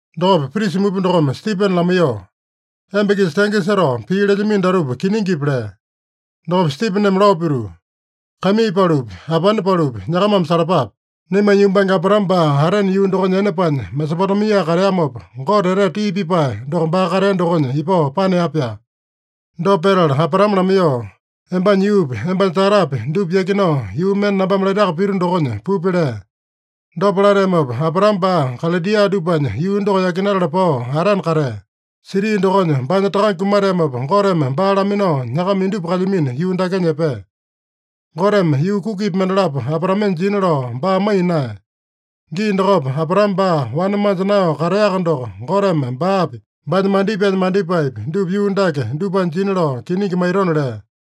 Dokopa prisa mupa dokome Stipene lamaiyoo, “Emba-kisa tenge setao pii lelyamino datupa kiningipi?” lea. Dokopa Stipeneme lao pituu, “Kaimii palupi, apane palupi, nyakamame salapape. Naimanya yumbange Abraame baa Arane yuu dokonya ene paanya, Mesopotemia kateamopa, Gote etete tii pipae doko baa katea dokonya ipao panea-pyaa. Dopa petala Abraame lamaiyoo, ‘Embanya yuupi, embanya tatapi, dupa yakinao yuu mende nambame laitaka pito dokonya pupi’ lea. Dopa lateamopa, Abraame baa Kalidia dupanya yuu doko yakinatala pao, Arane katea. Siti dokonya baanya takange kumateamopa, Goteme baa laminao nyakama indupa kalyamino yuu dakenya epea. Goteme yuu kukipi mendalapo Abraamenya jina lao baa maiya naeya. Gii dokopa, Abraame baa wane manja naeyao kateaka doko, Goteme baapi, baanya mandipaenya mandipaepi, dupa yuu dake dupanya jina lao kiningi maitona lea.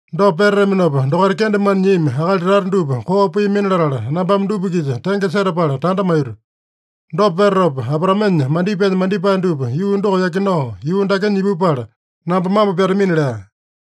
Dopa petataminopa, dokaita kendemane nyiami akali tata dupa koo piamina latala, nambame dupa-kisa tenge setapala tanda maito. Dopa petatopa, Abraamenya mandipaenya mandipae dupa yuu doko yakinao yuu dakenya ipupala, namba mambo pyatamina’ lea.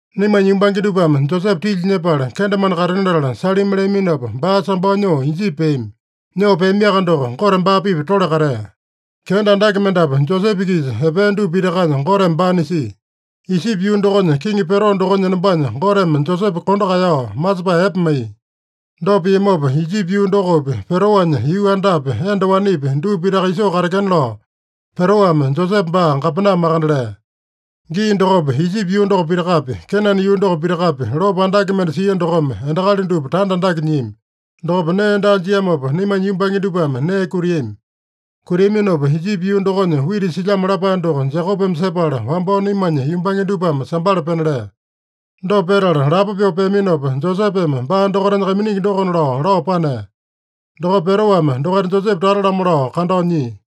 “Naimanya yumbange dupame Josepe tilya nyepala, kendemane katena latala salimi leaminopa, baa sambao nyoo Ijipi peami. Nyoo peamiaka doko, Gote baa-pipa tole katea. Kenda andake mendapu Josepe-kisa epea dupa pitakanya Goteme baa nisia. Ijipi yuu dokonya kiŋi Pero dokonya enombanya Goteme Josepe kondo kaeyao, masepae epe maiya. Dopa piamopa, Ijipi yuu dokopi, Peroanya yuu andapi, enda wanepi, dupa pitaka isoo katekena lao, Peroame Josepe baa gapena makande lea. Gii dokopa, Ijipi yuu doko pitakapi, Kenane yuu doko pitakapi, lopo andake mende sia dokome, endakali dupa tanda andake nyiami. Dokopa nee daa jiamopa, naimanya yumbange dupame nee kutiami. Kutiaminopa Ijipi yuu dokonya wita silyamo lapae doko Jekopeme sepala, wambao naimanya yumbange dupame sambala pena lea. Dopa petala lapo pyoo peaminopa, Josepeme baa dokaitanya kaiminingi dokona lao, lao panea. Dokopa Peroame dokaita Josepe tata-lamo lao kandao nyia.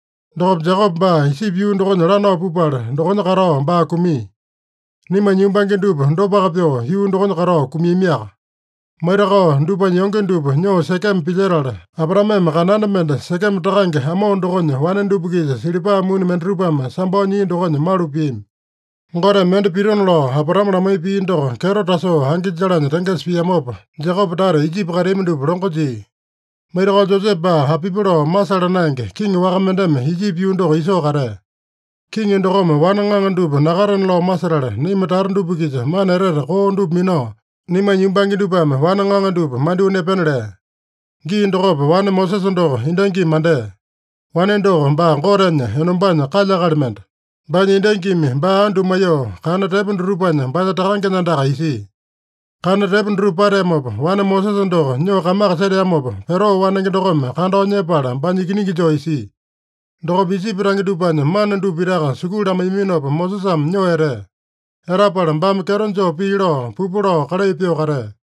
Dokopa Jekope baa Ijipi yuu dokonya lanao pupala, dokonya katao baa kumia. Naimanya yumbange dupa dopaka pyoo yuu dokonya katao kumiamiaka. Maitakao dupanya yonge dupa nyoo Sekeme pilyetala, Abraameme kananda mende Sekeme takange Amo dokonya wane dupa-kisa silipa muni mendatupame sambao nyia dokonya malu piami. “Goteme mende pitona lao Abraame lamaiya pii doko kyeto tasoo angi jalanya tengesa piamopa, Jekope tata Ijipi kateami dupa longo jia. Maitakao, Josepe baa apipi lao masala naenge, kiŋi waka mendeme Ijipi yuu doko isoo katea. Kiŋi dokome wane ŋaŋa dupa nakatena lao masetala, naima tata dupa-kisa mana etete koo dupa minao, naimanya yumbange dupame wane ŋaŋa dupa mandyoo nepena lea. Gii dokopa wane Mosesa doko endangimi mandea. Wane doko baa Gotenya enombanya kalya-akali mende. Baanya endangimi baa andu maiyoo, kana tepo dutupanya baanya takangenya andaka isia. Kana tepo dutupa pateamopa, wane Mosesa doko nyoo kamaka seteamopa, Pero wanenge dokome kandao nyepala baanya ikiningi joo isia. Dokopa Ijipi tange dupanya mana dupa pitaka sukulu lamaiyaminopa, Mosesame nyoo etea. Etapala baame kyeto joo pii lao, pupu lao kalai pyoo katea.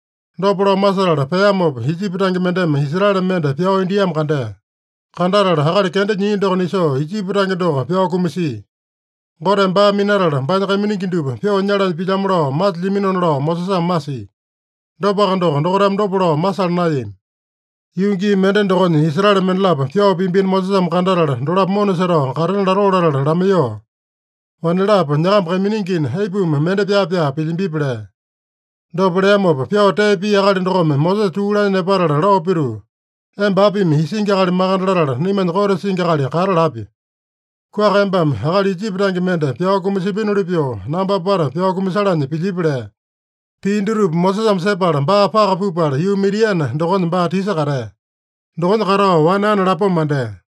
Dopa lao masetala peamopa, Ijipi tange mendeme Israele mende pyao indiamo kandea. Kandatala akali kenda nyia doko nisoo, Ijipi tange doko pyao kumasia. Goteme baa minatala, baanya kaiminingi dupa pyoo nyalanya pilyamo lao masilyaminona lao Mosesame masia. Dopaka doko, dokaitame dopa lao masala naeyami. Yuu gii mende dokonya, Israele mendalapo pyao piambino Mosesame kandatala, dolapo mona setao katena latoo latala lamaiyoo, ‘Wanelapo, nyakamba kaiminingina, aipuma mende pyaa-pyaa pilyambipi?’ lea. Dopa leamopa, pyao tee pia akali dokome Mosesa tuu lanya nepatala lao pituu, ‘Emba apimi isingi akali makande latala, naimanya kote singi akali kata lapya? Kuaka embame akali Ijipi tange mende pyao kumasipinoli pyoo, namba apata pyao kumasalanya pilyipi?’ lea. Pii dutupa Mosesame sepala, baa paka pupala, yuu Midiane dokonya baa tisa katea. Dokonya katao wane ane lapoma mandea.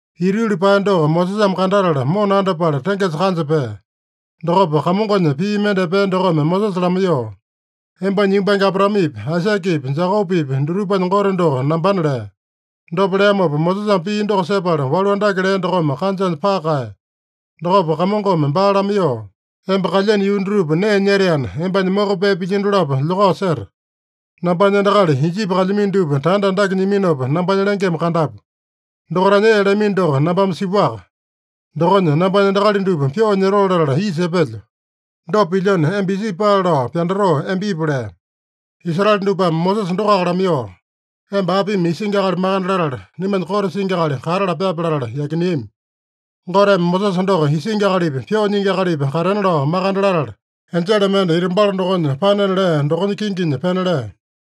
Ita yuli paeya doko Mosesame kandatala, mona andapala tengesa kanja pea. Dokopa Kamongonya pii mende epea dokome Mosesa lamaiyoo, ‘Embanya yumbange Abraamepi, Aisakepi, Jekopepi dutupanya Gote doko nambana’ lea. Dopa leamopa, Mosesame pii doko sepala walu andake lea dokome kanjanya paka kaeya. Dokopa Kamongome baa lamaiyoo, ‘Emba kalyeno yuu dutupa nee nyetaena, embanya moko pee pilyino dolapo lyokao seta. Nambanya endakali Ijipi kalyamino dupa tanda andake nyiminopa, nambanya lengeme kandapu. Dokaitanya ee lamino doko nambame sipuaka. Dokonya nambanya endakali dupa pyoo nyotoo latala isa epelyo. Dopa pilyona, emba Ijipi paale lao pyandatoo, emba ipu’ lea. “Israele dupame Mosesa dokoaka lamaiyoo, ‘Emba apimi isingi akali makande latala, naimanya kote singi akali kata lapyape’ latala yakineami. Goteme Mosesa doko isingi akalipa, pyoo nyingi akalipa katena lao makande latala, enjele mende ita balo dokonya panena lea dokonya kinginya pena lea.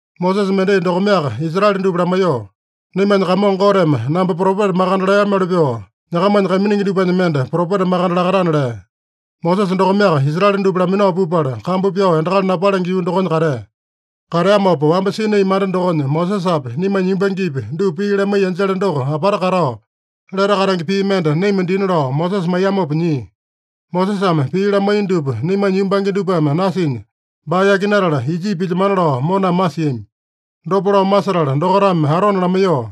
Mosesa mendai dokomeaka Israele dupa lamaiyoo, ‘Naimanya Kamongo Goteme namba propeta makande leamoli pyoo, nyakamanya kaiminingi dupanya mende propeta makande lakatana’ lea. Mosesa dokomeaka Israele dupa laminao pupala, kambu pyao endakali napalenge yuu dokonya katea. Kateamopa, wamba Sinai manda dokonya Mosesapi, naimanya yumbangepi, dupa pii lamaiya enjele doko apata katao, lete katenge pii mende naima dina lao Mosesa maiyamopa nyia. Mosesame pii lamaiya dupa naimanya yumbange dupame nasinya, baa yakinatala Ijipi pilyemana lao moname masiami. Dopa lao masetala dokaitame Arone lamaiyoo,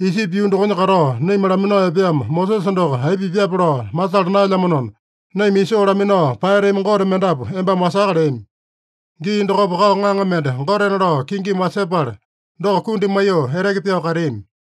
‘Ijipi yuu dokonya katao naima laminao epeamo Mosesa doko aipa pipyape lao masala naelyamanona, naima isoo laminao paeyatami gote mendapu embame wasaka’ leami. Gii dokopa kao ŋaŋa mende gotena lao kingimi wasepala, doko kundi maiyoo eteke pyao kateami.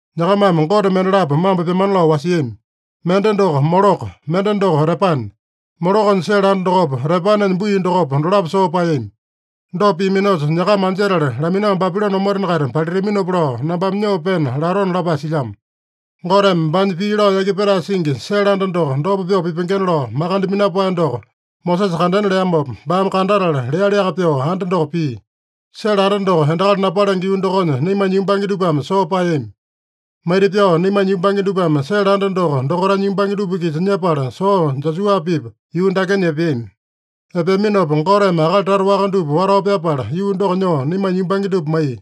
Nyakamame gote mendalapo mambo pyamana lao wasiami. Mende doko Moloko, mende doko Repane. Molokonya sele anda dokopa, Repanenya bui dokopa, dolapo soo paeyami. Dopa piaminosa, nyakama anjetala laminao Babilone omotena-kaita palitaminopa lao nambame nyoo pena latona’ lapae silyamo. “Goteme baanya pii lao yaki petae singi sele anda doko dopa pyoo pipengena lao makande minapae doko Mosesa kandena leamopa, baame kandatala lealiaka pyoo anda doko pia. Sele anda doko endakali napalenge yuu dokonya naimanya yumbange dupame soo paeyami. Maita-pyao naimanya yumbange dupame sele anda doko dokaitanya yumbange dupa-kisa nyepala soo Josua-pipa yuu dakenya epeami. Epeaminopa Goteme akali tata waka dupa watao pyapala, yuu doko nyoo naimanya yumbange dupa maiya.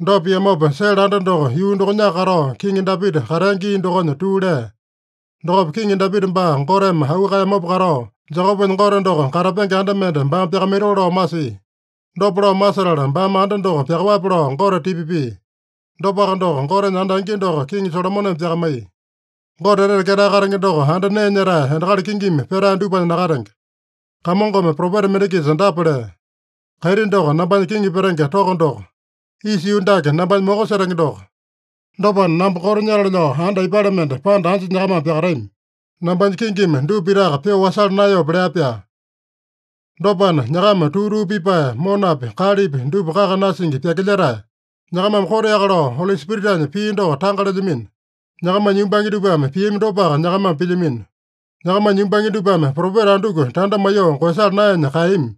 Dopa piamopa, sele anda doko yuu dokonyaka katao, Kiŋi Dapita katea gii dokonya tuu lea. Dokopa Kiŋi Dapita baa Goteme auu kaeyamopa katao, Jekopenya Gote doko katapenge anda mende baame pyakamaitoo lao masia. Dopa lao masetala, baame anda doko pyakaowape lao Gote tipa pia. Dopaka doko, Gotenya anda angi doko Kiŋi Solomoneme pyakamaiya. Gote Etete Ketae Katenge doko anda nee nyetae, endakali kingimi petae dupanya nakatenge. Kamongome propeta mende-kisa dapa lea: ‘Kaiti doko nambanya kiŋi petenge toko doko. Isa yuu dake nambanya moko setenge doko. Dopana, namba koto nyatale lao anda aipale mende, panda anja nyakamame pyakatami? Nambanya kingimi dupa pitaka pyoo wasala naeyope?’ lea-pyaa. “Dopana, nyakama tuu-tuu pipae, monapi, kalepi dupa kaka nasingi pyakilyetae! Nyakamame koteaka lao Oli Spiritanya pii doko tanga lelyamino. Nyakamanya yumbange dupame piami dopaka nyakamame pilyamino. Nyakamanya yumbange dupame propeta anduku tanda maiyoo koeyasala naenya kaeyami?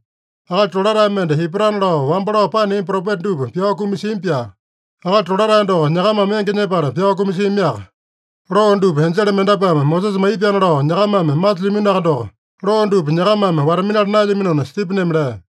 Akali Tolatae mende ipatana lao, wamba lao paneami propeta dupa pyao kumasiami-pyaa. Akali Tolatae doko nyakamame enge nyepala pyao kumasiamiaka. Loo dupa enjele mendapuame Mosesa maiyami-pyaana lao nyakamame masilyaminoaka doko, loo dupa nyakamame wata-minala naelyaminona” Stipeneme lea.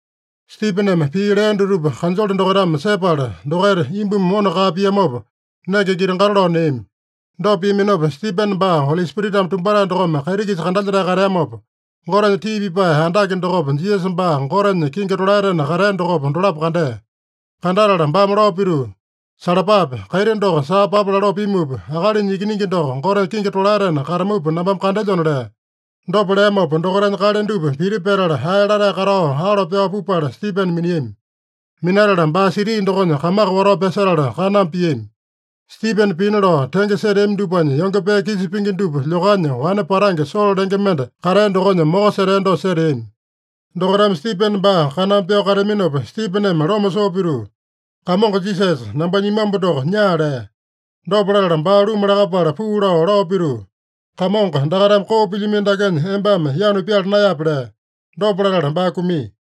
Stipeneme pii lea dutupa kanjole dokaitame sepala, dokaita imbumi mona kaa piamopa, nenge giti-gato lao neami. Dopa piaminopa, Stipene baa Oli Spiritame tumbatae dokome kaiti-kisa kandalyetae kateamopa, Gotenya tii pipae andake dokopa, Jisasa baa Gotenya kingi tolaetena katea dokopa, dolapo kandea. Kandatala baame lao pituu, “Salapape! Kaiti doko saa papa laloo pimupa, Akalinya Ikiningi doko Gotenya kingi tolaetena katamupa nambame kandelyona” lea. Dopa leamopa, dokaitanya kale dupa piti petala, ae latae katao alo pyao pupala Stipene miniami. Minatala baa siti dokonya kamaka watao pyasetala kaname piami. Stipene pina lao tenge seteami dupanya yonge pee kisa pingi dupa lyokanya, wane patange Solo lenge mende katea dokonya moko setea dosa seteami. Dokaitame Stipene baa kaname pyao kateaminopa, Stipeneme loma soo pituu, “Kamongo Jisasa, nambanya imambu doko nyaa” lea. Dopa latala, baa luma lakapala puu lao, lao pituu, “Kamongo, dakaitame koo pilyamino dakenya embame yanu pyala naeyape” lea. Dopa latala baa kumia.